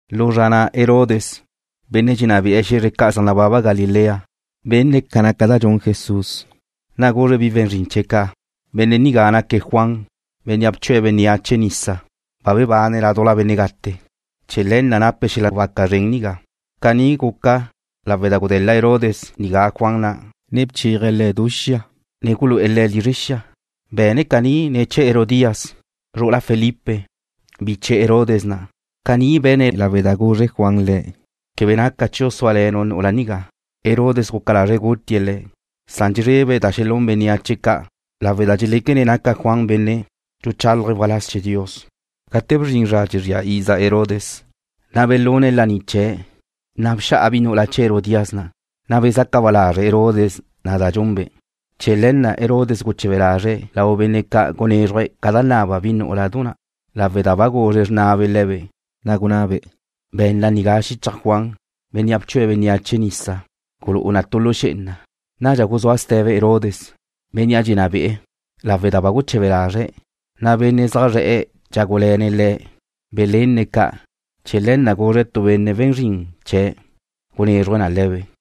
Lu zra na' Herodes, benne' dxenná be'e̱ xe̱zre ca' zaj nababa na Galilea, benne̱' ca naca da dxun Jesús. Na' guzre̱' bi we̱n zrin chee̱' ca': ―Benne' nigá naque̱' Juan, bénnea' bchue̱' bénneache nisa. Ba bebane̱' ládujla benne' gate. Chee̱ le̱ na' nape̱' xel-la' waca zren nigá. Caní gunné̱' lawe' da gude̱la Herodes nigá Juan na', ne bchéaje̱' le̱' du xia, ne gulu'e̱ le̱' lizre xia. Be̱ne̱' caní ne̱ chee̱ Herodías, zru'ula Felipe, biche Herodes na'. Caní be̱ne̱' lawe' da guzre Juan le̱': ―Quebe naca chiu' súale̱nu' nu'ula nigá. Herodes guca lazre̱' gutie̱' le̱', san dxezrebe̱' da xelún bénneache ca' lawe' da dxeléquene̱' naca Juan benne' dxuchálaje̱' waláz chee̱ Dios. Gate bzrin zra dxezría iza Herodes, na' belune̱' laní chee̱', na' bxa'a bi nu'ula chee̱ Herodías na', na' bezaca ba lazre' Herodes na' da dxunbe'. Chee̱ le̱ na' Herodes guche̱be lazre̱' lau benne' ca' gunézruje̱' ca da naba bi nú'uladu na'. Lawe' da ba guzre xrnabe' le̱be', na' gunabe': ―Be̱nna nigá xichaj Juan, bénnea' bchue̱' bénneache nisa. Gulú'u na tu lu xé'ena. Nadxa guzúa ste̱be Herodes, bénnea' dxenná be'e̱, san lawe' da ba guche̱be lazre̱', na' benne' zaj zre̱'e̱ dxágule̱ne̱' le̱' belenne̱' ca', chee̱ le̱ na' guzre̱' tu benne' we̱n zrin chee̱' gunézruje̱' na le̱be'.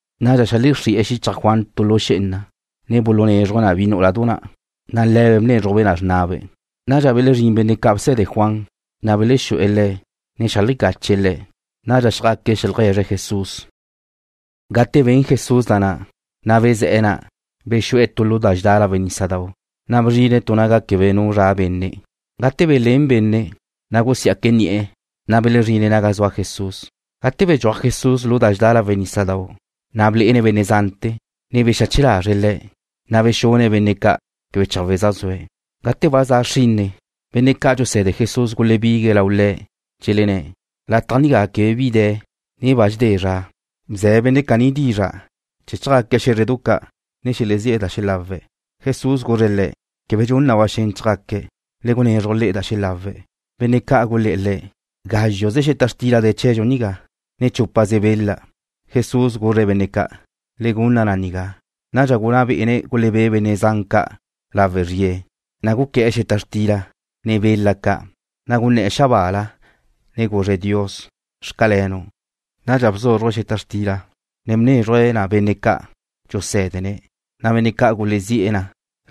Nadxa xeajlexrí'e̱ xíchaje̱' tu lu xé'ena, ne bulunézruje̱' na bi nú'uladu na', na' le̱be' bnézrujbe' na xrnabe'. Nadxa belezrín benne' ca' bse̱de Juan, na' belexú'e̱ le̱', ne xeajlecache̱' le̱'. Nadxa xjaque̱' xeajlegue̱zre̱' Jesús. Gate ben Jesús da na', na' bezé̱'e̱ na', bexu'e̱ tu lu da dxedá lawe' nísadau', na' bzrine̱' tu naga quebe nu zra' benne'. Gate belén bénneache, na' gusiá'que̱' ni'e̱, na' belezrine̱' naga zua Jesús. Gate bedxúaj Jesús lu da dxedá lawe' nísadau', na' blé'ene̱' benne' zante̱, ne bexache lazre̱' le̱', na' bexune̱' benne' ca' quebe chawe' zaj zue̱'. Gate ba za xrinne, benne' ca' dxuse̱de Jesús gulebigue̱' lau Le̱', dxelenné̱': ―Lataj nigá quebe bi de̱, ne ba dxedé zra. Bze̱ benne' caní dizra' chee̱ chjaque̱' xé̱zredu ca', ne xelezí'e̱ da xelawe̱'. Jesús guzre̱' le̱': ―Quebe dxun na ba xen chjaque̱'. Le gunezruj le'e da xelawe̱'. Benne' ca' gulé̱'e̱ Le̱': ―Gázxuze xeta xtila de̱ chee̱dxu nigá, ne chúpaze bela. Jesús guzre̱' benne' ca': ―Le gunna na nigá. Nadxa gunná bé'ene̱' gulebé' benne' zan ca' lawe' zrie̱. Guqué̱'e̱ xeta xtila, ne bela ca', na' gunné̱'e̱ xabaala, ne guzre̱' Dios: “Xcalenu'.” Nadxa bzúzruje̱' xeta xtila, ne bnézruje̱' na benne' ca' dxusé̱dene̱', na' benne' ca' gulísie̱' na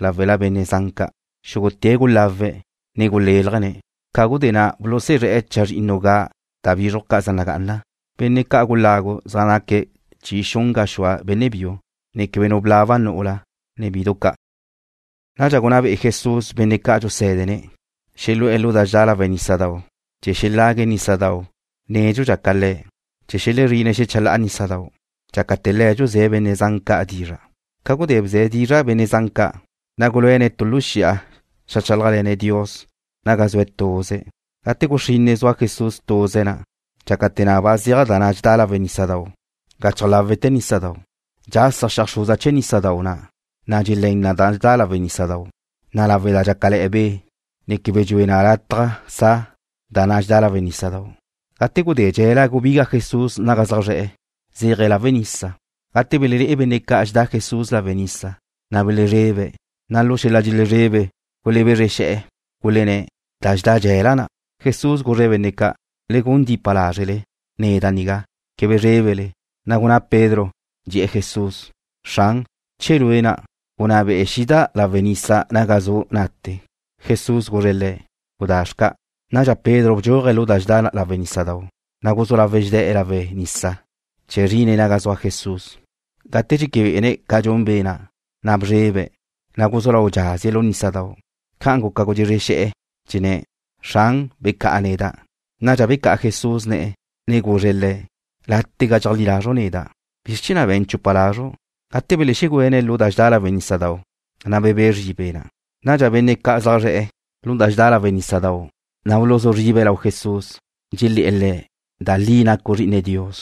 láwela benne' zan ca'. Xúgute̱' gulawe̱', ne gulélajene̱'. Ca gudé na' bulusuzré̱'e̱ chazrinnu ga' da bízrujdu ca' zaj nagá'ana. Benne' gulawe̱' na zaj naque̱' chi xun gaxúa benne' biu, ne quebe nu blaba nu'ula, ne bidu ca'. Nadxa gunná be'e Jesús benne' ca' dxusé̱dene̱' xelu'e̱ lu da dxedá lawe' nísadau' chee̱ xelague̱' nísadau' nédxudxa ca Le̱' chee̱ xelexezrine̱' xéchala'a nísadau' na', dxácate̱ Le̱' dxuzé̱ benne' zan ca' dizra'. Ca gudé bze̱' dizra' benne' zan ca', na' guluéne̱' tu lu xi'a xeajchálajle̱ne̱' Dios naga zue̱' tuze̱'. Gate guxrinne zua Jesús tuze̱' na'. Dxácate̱ na' ba zeaj da na' dxedá lawe' nísadau' gachaj láwe'te̱ nísadau' na'. Nadxa guxasa xeajxruza chee̱ nísadau' na', da dxutá na da dxedá lawe' nísadau' na', lawe' da dxácale̱'e̱ be', ne quebe dxue na lataj sa na. Gate gudé dxe̱la gubiga Jesús naga zaj zre̱'e̱, zéaje̱' lawe' nisa. Gate belelé'e benne' ca' dxedá Jesús lawe' nisa, na' belezrebe̱', na' lu xel-la' dxelezrebe gulebézrexe̱'e̱, gulenné̱': ―Da dxedá dxe̱la na'. Jesús guzre̱' benne' ca': ―Le gun dipa lázrele. Neda' nigá. Quebe zrébele. Na' gunná Pedro, dxe̱'e̱ Jesús: ―Xran, che Lue' na', gunná be'e xida' lawe' nisa naga zu' na'te. Jesús guzre̱' le̱': ―Gudá xca'. Nadxa Pedro bdxúaje̱' lu da dxedá lawe' nísadau', ne guzú lawe̱' dxezé̱'e̱ lawe' nisa chee̱ zrine̱' naga zua Jesús. Gate dxeque be'ene̱' ca dxun be' na', na' bzrebe̱', ne guzú lau dxazie̱' lu nísadau' na'. Ca'an guca gudxezre xe̱'e̱, gunné̱': ―Xran, becá'a neda'. Nadxa becá'a Jesús ne̱'e̱, ne guzre̱' le̱': ―Látega dxeajlí lazru' neda'. ¿Bizr chee̱ na' be̱n chupa lazru'? Gate belexegüene̱' lu da dxedá lawe' nísadau', na' bebé' zri be' na'. Nadxa benne' ca' zaj zre̱'e̱ lu da dxedá lawe' nísadau' na' buluzú zribe̱' lau Jesús, dxelé̱'e̱ Le̱': ―Da li nacu' Zri'ine Dios.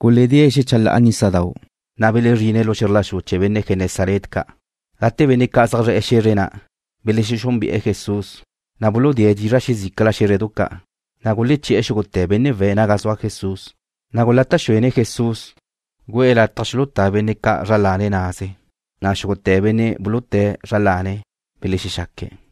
Guledée̱' xecha la'a nísadau', na' belezrine̱' lu xe̱zr la xu chee̱ benne' Genesaret ca'. Gate benne' ca' zaj zre̱'e̱ xe̱zre na' belexexúnbe'e̱ Jesús, na' buludée̱' dizra' xezícala xé̱zredu ca', na' guleché̱'e̱ xúgute̱ benne' we̱' naga zua Jesús. Gulata' xuene̱' Jesús gu'e̱ lataj xulutá benne' ca' zra lane̱' naze. Xúgute̱ benne' buluté̱' zra lane̱' belexexaque̱'.